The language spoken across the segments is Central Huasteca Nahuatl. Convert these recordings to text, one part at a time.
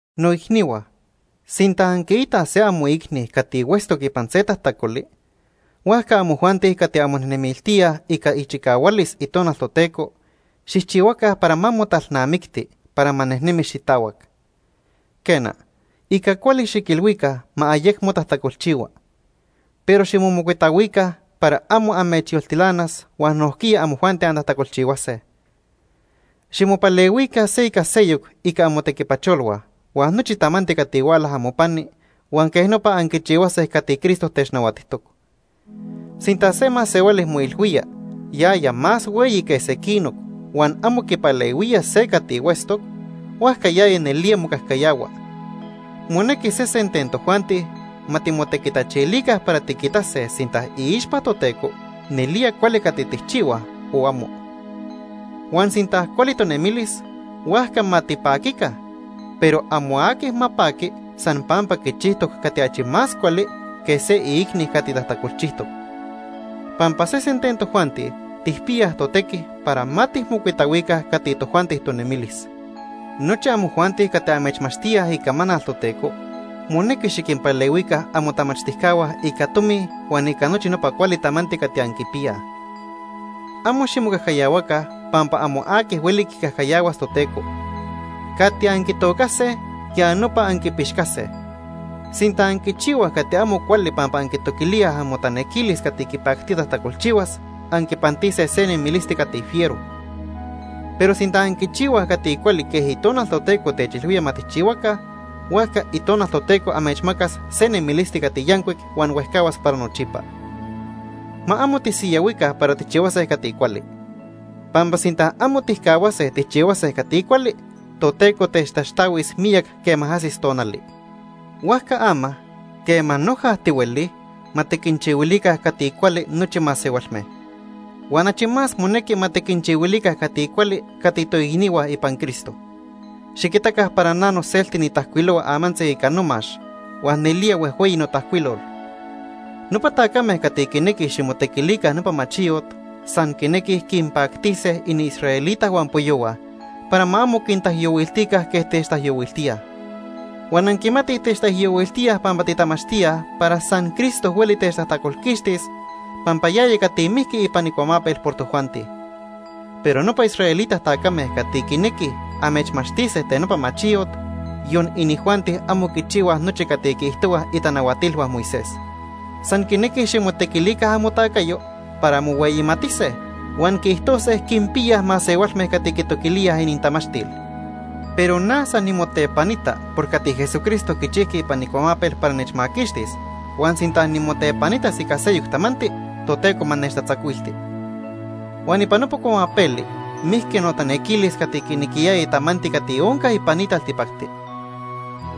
Noicnihua, sinta anquiitaj se amoicni cati huetztoc ipan se tajtacoli, huajca amojuanti cati anmonemiltíaj ica ichicahualis Itonal Toteco xijchihuaca para ma motalnamictis para ma nejnemi xitahuac. Quena, ica cuali xiquilhuica ma ayecmo tajtacolchihua. Pero ximomocuitahuica para amo amechyoltilanas huan nojquiya amojuanti antajtacolchihuase. Ximopalehuica se ica seyoc ica amotequipacholhua huan nochi tamanti cati huala amopani huan quej nopa anquichihuase cati Cristo technahuatijtoc. Sinta se masehuali moilhuía yaya más hueyi que sequinoc huan amo quipalehuía se cati huetztoc, huajca yaya nelía mocajcayahua. Monequi sesen ten tojuanti ma timotequitachilica para tiquitase sinta iixpa Toteco nelía cuali cati tijchihuaj o amo. Huan sinta cuali tonemilis, huajca ma tipaquica, pero amo aqui ma paqui san pampa quichijtoc cati achi más cuali que se iicni cati tajtacolchijtoc. Pampa sesen ten tojuanti tijpiyaj totequi para ma tijmocuitahuica cati tojuanti tonemilis. Nochi amojuanti cati amechmachtíaj icamanal Toteco, monequi xiquinpalehuica amotamachtijcahua ica tomi huan ica nochi nopa cuali tamanti cati anquipiyaj. Amo ximocajcayahuaca pampa amo aqui hueli quicajcayahuas Toteco. Cati anquitocase, ya nopa anquipixcase. Sinta anquichihuaj cati amo cuali pampa anquitoquilíaj amotanequilis cati quipactía tajtacolchihuas, anquipantise se nemilisti cati fiero. Pero sinta anquichihuaj cati cuali quej Itonal Toteco techilhuía ma tijchihuaca, huajca Itonal Toteco amechmacas se nemilisti cati yancuic huan huejcahuas para nochipa. Ma amo tisiyahuica para tijchihuase cati cuali, pampa sinta amo tijcahuase tijchihuase cati cuali, Toteco techtaxtahuis miyac quema ajsis tonali. Huajca ama, quema noja tihuelij, ma tiquinchihuilica cati cuali nochi masehualme. Huan achi más monequi ma tiquinchihuilica cati cuali cati toicnihua ipan Cristo. Xiquitaca para na noselti nitajcuilohua amantzi ica nomax huan nelía huejhueyi notajcuilol. Nopa tacame cati quinequij ximotequilica nopa machiyot san quinequij quinpactise iniisraelita huampoyohua para ma amo quintaijyohuiltica quej techtaijyohuiltíaj. Huan anquimatij techtaijyohuiltíaj pampa titamachtíaj para san Cristo hueli techtajtacolquixtis, pampa yaya cati mijqui ipan icuamapel por tojuanti. Pero nopa israelita tacame cati quinequij amechmachtise ten nopa machiyot, yon inijuanti amo quichihuaj nochi cati quiijtohuaj itanahuatilhua Moisés. San quinequij ximotequilica amotacayo para mohueyimatise huan quiijtose quinpiyaj masehualme cati quitoquilíaj inintamachtil. Pero na san nimotepanita por cati Jesucristo quichijqui ipan icuamapel para nechmaquixtis huan sinta nimotepanitas ica seyoc tamanti, Toteco ma techtatzacuilti. Huan ipan nopa cuamapeli mijqui notanequilis cati quinequiyaya tamanti cati onca ipan ni taltipacti.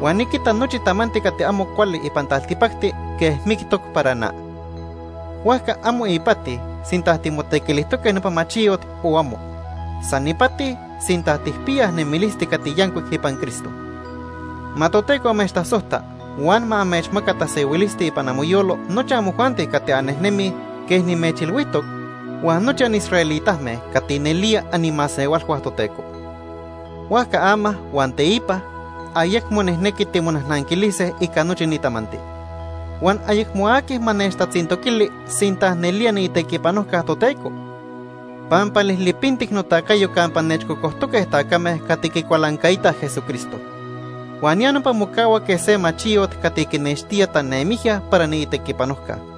Huan niquita nochi tamanti cati amo cuali ipan taltipacti quej mictoc para na. Huajca amo ipati sinta timotequilijtoque nopa machiyot o amo. San ipati sinta tijpiyaj nemilisti cati yancuic ipan Cristo. Ma Toteco amechtasojta huan ma amechmaca tasehuilisti ipan amoyolo nochi amojuanti cati annejnemij quej nimechilhuijtoc huan nochi anisraelitame cati nelía animasehualhua Toteco. Huajca ama huan teipa ayecmo nijnequi timonajnanquilise ica nochi ni tamanti. Huan ayecmo aqui ma nechtatzintoquili sinta nelía niitequipanojca Toteco, pampa lijlipintic notacayo campa nechcocojtoque tacame cati quicualancaitaj Jesucristo. Huan ya nopa mocahua quej se machiyot cati quinextía tanemijya para niitequipanojca.